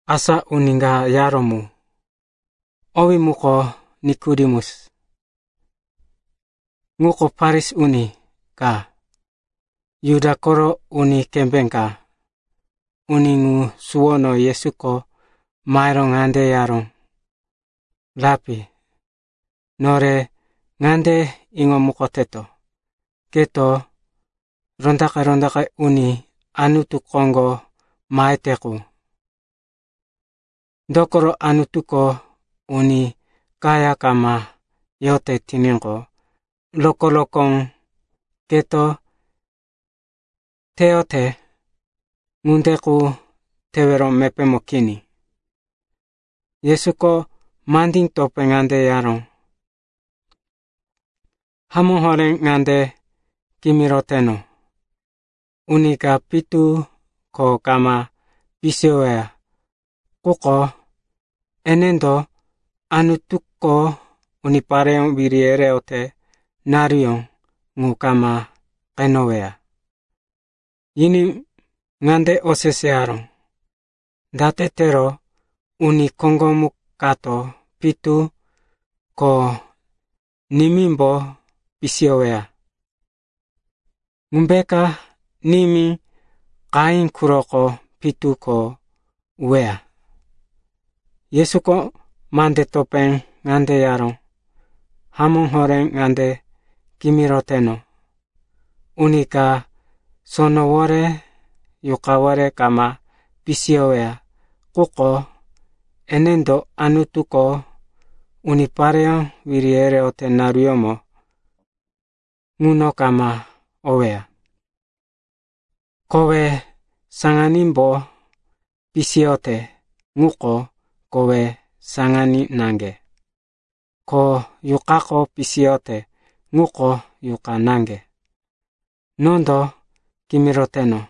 Asa uni ka yaró mu, owí muko Nikodemus. Ŋuko Farisi uni ka, Juda koro uni kembé ka. Uni ŋu suwono Yesuko mahero ŋande yaró, “Rapi, nore ŋande iŋomukoteto, keko rondaqe-rondaqe uni Anutu koŋgo mahete qu. Dokoro Anutuko uni kaya kama yote tiníqo, rokó-rokó keto teyote ŋunde qu tewero mepémo kini.” Yesuko mandí topé ŋande yaró, “Hamó horé ŋande kimiroteno, uni ka pitu ko kama pisiyoweya quko, enendo Anutuko unipareyó wiri yereyote naruyó ŋu kama qeneweya.” Yiní ŋande oseseyaró, “Date tero uni koŋgomu kato pitu ko nimímbo pisiyoweya? Ŋumbeka nimí qahí quroko pitu ko uweya?” Yesuko mande topé ŋande yaró, “Hamó horé, ŋande kimiroteno, uni ka sonowore, Yuqawore kama pisiyoweya quko, enendo Anutuko unipareyó wiri yereyote naruyómo ŋuno kama oweya. Kowe saŋanímbo pisiyote ŋuko kowe saŋaní naŋge, ko Yuqako pisiyote ŋuko yuqa naŋge. Nondo kimiroteno,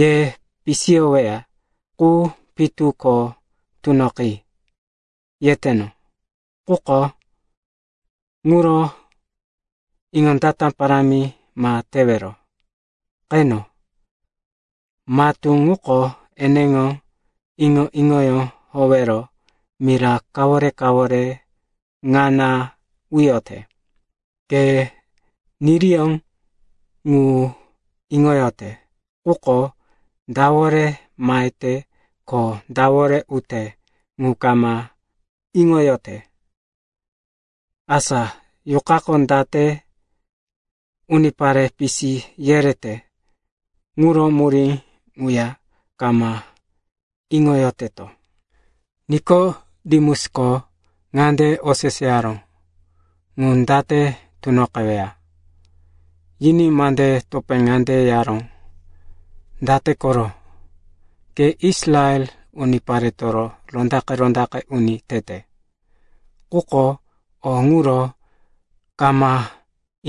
‘Ye pisiyoweya qu pitu ko tunoqi,’ yeteno, quko ŋuro iŋondata parámi ma tewero. Qeno, matú ŋuko eneŋo iŋo-iŋoyó howero mira kawore-kawore ŋana uyote. Ke niriyó ŋu iŋoyote, quko dawore mahete ko dawore ute ŋu kama iŋoyote. Asa Yuqako date unipare pisi yerete ŋuro murí ŋuya kama iŋoyoteto.” Nikodemusko ŋande oseseyaró, “Ŋu date tunoqeweya?” Yiní mande topé ŋande yaró, “Date koro? Ke Israel uniparetoro rondaqe-rondaqe uni tete, quko o ŋuro kama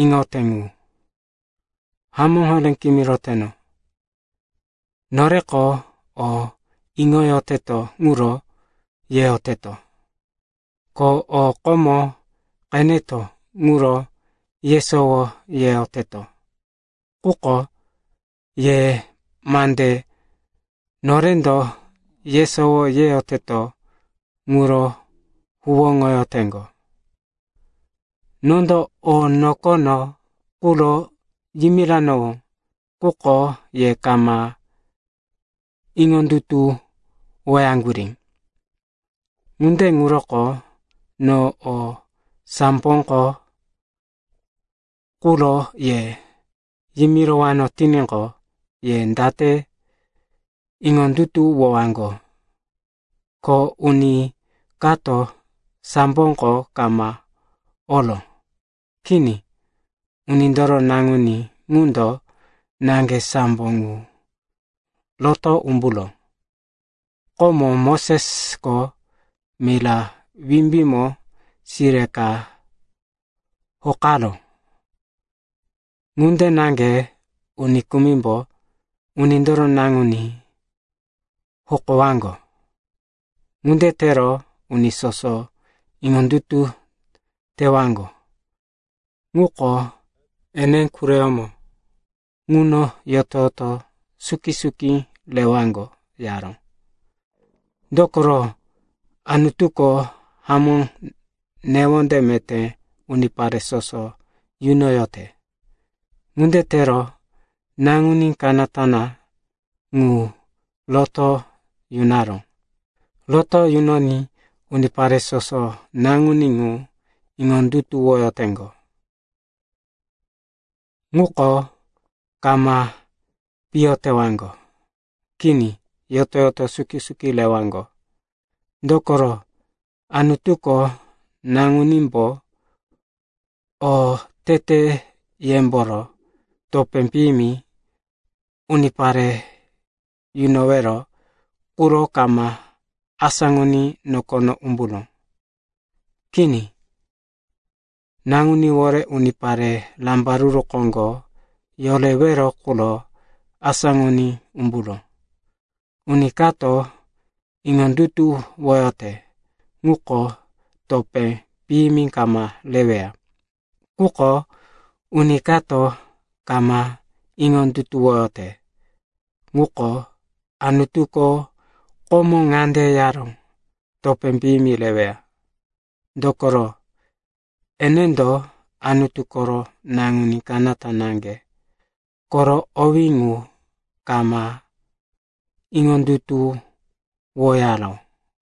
iŋote ŋu? Hamó horé kimiroteno, noreko o iŋoyoteto ŋuro yeyoteto. Ko o komo qeneto ŋuro yesowo yeyoteto. Quko ye mande norendo yesowo yeyoteto ŋuro huwóŋoyoteŋgo. Nondo o nokono quro yimiranowó, quko ye kama iŋondutuwoyaŋgurí. Ŋunde ŋuroko no o samboko quro ye yimirowano tiníqo, ye date iŋondutuwowaŋgo? Ko uni kato samboko kama oró. Kini. Unindoro Naŋuní ŋundo naŋge sambo ŋu roto umburó. Komo Mosesko mira wimbímo sire ka hokaró, ŋunde naŋge uni kumimbo Unindoro Naŋuní hokowaŋgo. Ŋunde tero uni soso iŋondutu tewaŋgo ŋuko ene quroyómo ŋuno yoto-yoto suki-suki rewaŋgo,” yaró. Dokoro Anutuko hamó newonde meté unipare soso yunoyote. Ŋunde tero Naŋuní Kanata Naŋge ŋu roto yunaró. Roto yunoní unipare soso Naŋuní ŋu iŋondutuwoyoteŋgo ŋuko kama piyo tewaŋgo. Kini, yoto-yoto suki-suki rewaŋgo. Dokoro Anutuko Naŋunímbo oteteyemboro topé piyimi unipare yunowero quro kama asáŋoní nokono umburó. Kini, Naŋuníwore unipare rambaruru koŋgo yorewero quro asáŋoní umburó. Uni kato iŋondutuwoyote ŋuko topé piyimi kama reweya. Quko uni kato kama iŋondutuwoyote ŋuko, Anutuko komo ŋande yaró, topé piyimi reweya. Dokoro, enendo Anutu koro Naŋuní Kanata Naŋge koro owí ŋu kama iŋondutuwoyaró.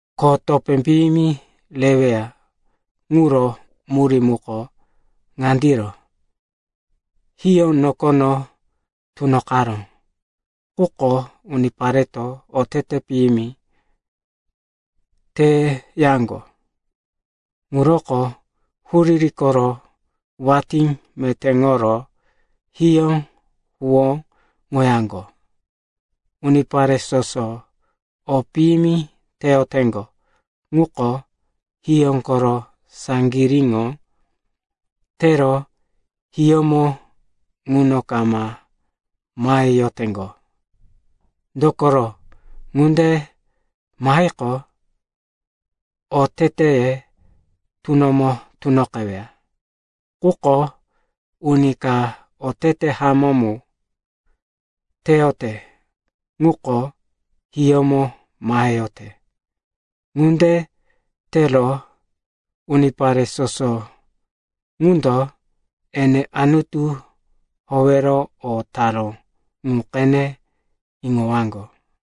Ko topé piyimi reweya ŋuro murí muko ŋandiro: hiyó nokono tunoqaró. Quko unipareto otete piyimi teyaŋgo. Ŋuroko huriri koro watí metéŋoro hiyó huwóŋoyaŋgo. Unipare soso o piyimi teyoteŋgo ŋuko, hiyó koro saŋgiríŋo tero hiyómo ŋuno kama maheyoteŋgo. Dokoro ŋunde mahiqo, oteteye tunomo tunoqeweya. Quko uni ka otete hamó mu teyote ŋuko hiyómo maheyote. Ŋunde tero unipare soso ŋundo ene Anutu howero o taró ŋu qene iŋowaŋgo.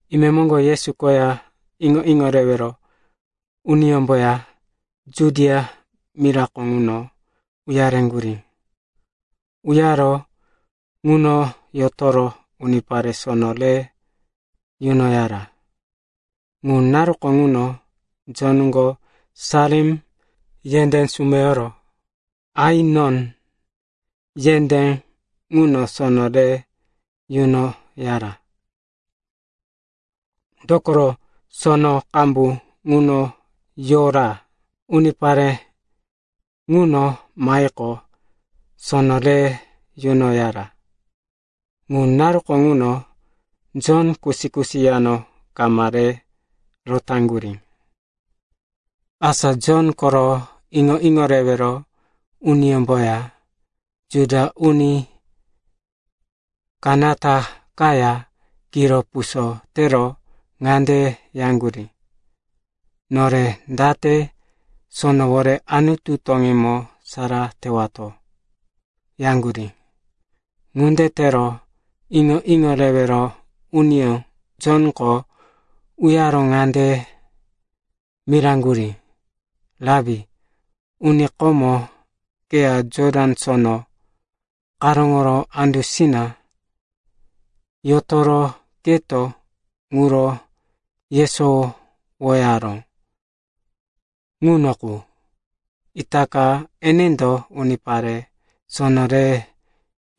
Imemoŋgo Yesu koya iŋo-iŋo rewero uniyómboya Judia mirako ŋuno uyareŋgurí. Uyaro ŋuno yotoro unipare sono re yunoyara. Ŋu naruko ŋuno Jonko Salim yendé sumeyoro Ainon yendé ŋuno sono re yunoyara. Dokoro sono qambu ŋuno yora. Unipare ŋuno mahiqo, sono re yunoyara. (Ŋu naruko ŋuno Jon kusi-kusi yano kama re rotaŋgurí.) Asa Jon koro iŋo-iŋo rewero uniyómboya Juda uni kanata kaya kiro puso tero ŋande yaŋgurí, “Nore date sonoworo Anutu toŋímo sara tewato,” yaŋgurí. Ŋunde tero iŋo-iŋo rewero uniyó Jonko uyaro ŋande miraŋgurí, “Rapi, uni komo keya Jotan Sono karóŋo andusina yotoro keto ŋuro yesowoyaró ŋuno qu, itaka enendo unipare sono re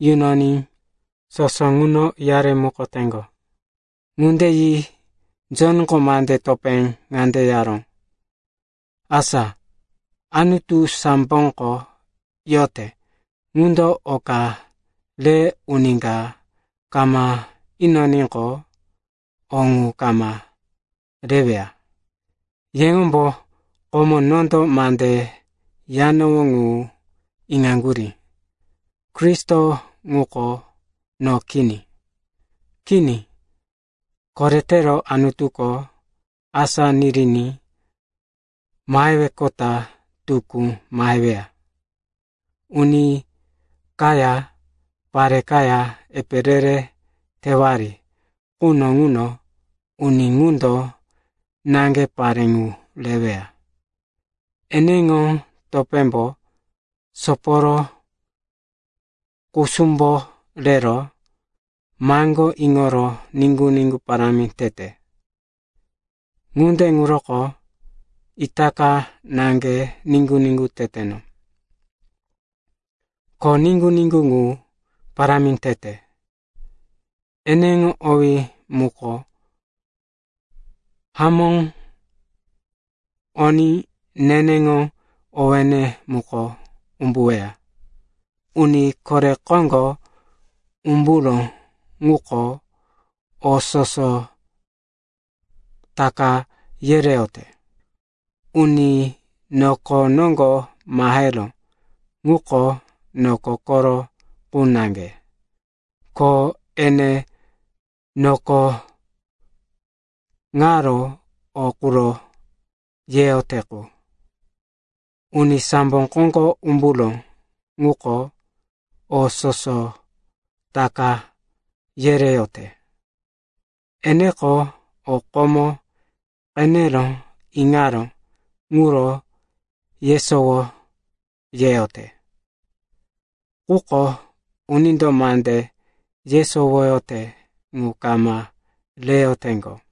yunoní soso ŋuno uyaremukoteŋgo.” Ŋunde yi Jonko mande topé ŋande yaró, “Asa Anutu samboko yote ŋundo oka re uni ka kama inoníqo, o ŋu kama reweya. Yeŋombo komo nondo mande yanowó ŋu iŋaŋgurí, ‘Kristo ŋuko no kini. Kini, koretero Anutuko asá niriní maheweqota tukú maheweya.’ Uni kaya pare kaya epe re-re tewari quno ŋuno uni ŋundo naŋge pare ŋu reweya. Eneŋo topémbo soporo kusumbo rero maŋgó iŋoro niŋgu-niŋgu parámi tete. Ŋunde ŋuroko itaka naŋge niŋgu-niŋgu teteno, ko niŋgu-niŋgu ŋu parámi tete. Eneŋo owí muko hamó oní neneŋo owéne muko umbuweya. “Uni kore koŋgo umburó ŋuko o soso taka yereyote. Uni noko noŋgo maheró ŋuko noko koro qu naŋge, ko ene noko ŋaro o quro yeyote qu. Uni sambo koŋgo umburó ŋuko o soso taka yereyote. Eneko o komo qenero iŋaró ŋuro yesowo yeyote. Quko unindo mande yesowoyote ŋu kama reyoteŋgo.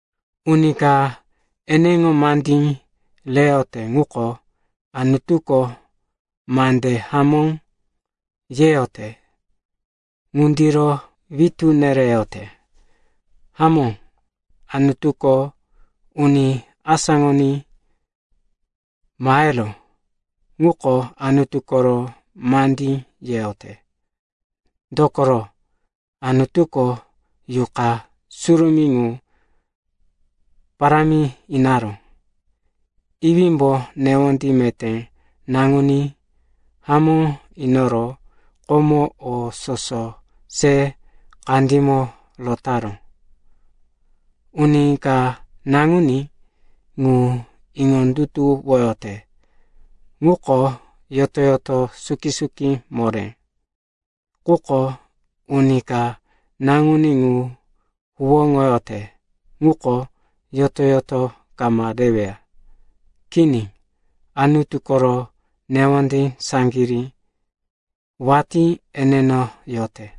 Uni ka eneŋo mandí reyote ŋuko, ‘Anutuko mande hamó yeyote,’ ŋundiro witú nereyote. Hamó, Anutuko uni asáŋoní maheró ŋuko Anutu koro mandí yeyote, dokoro, Anutuko Yuqa Surumí ŋu parámi inaró. Iwímbo newonde meté Naŋuní hamó inoro komo o soso se kandímo rotaró. Uni ka Naŋuní ŋu iŋondutuwoyote ŋuko yoto-yoto suki-suki moré. Quko uni ka Naŋuní ŋu huwóŋoyote ŋuko yoto-yoto kama reweya. Kini. Anutu koro newonde saŋgirí watí eneno yote.”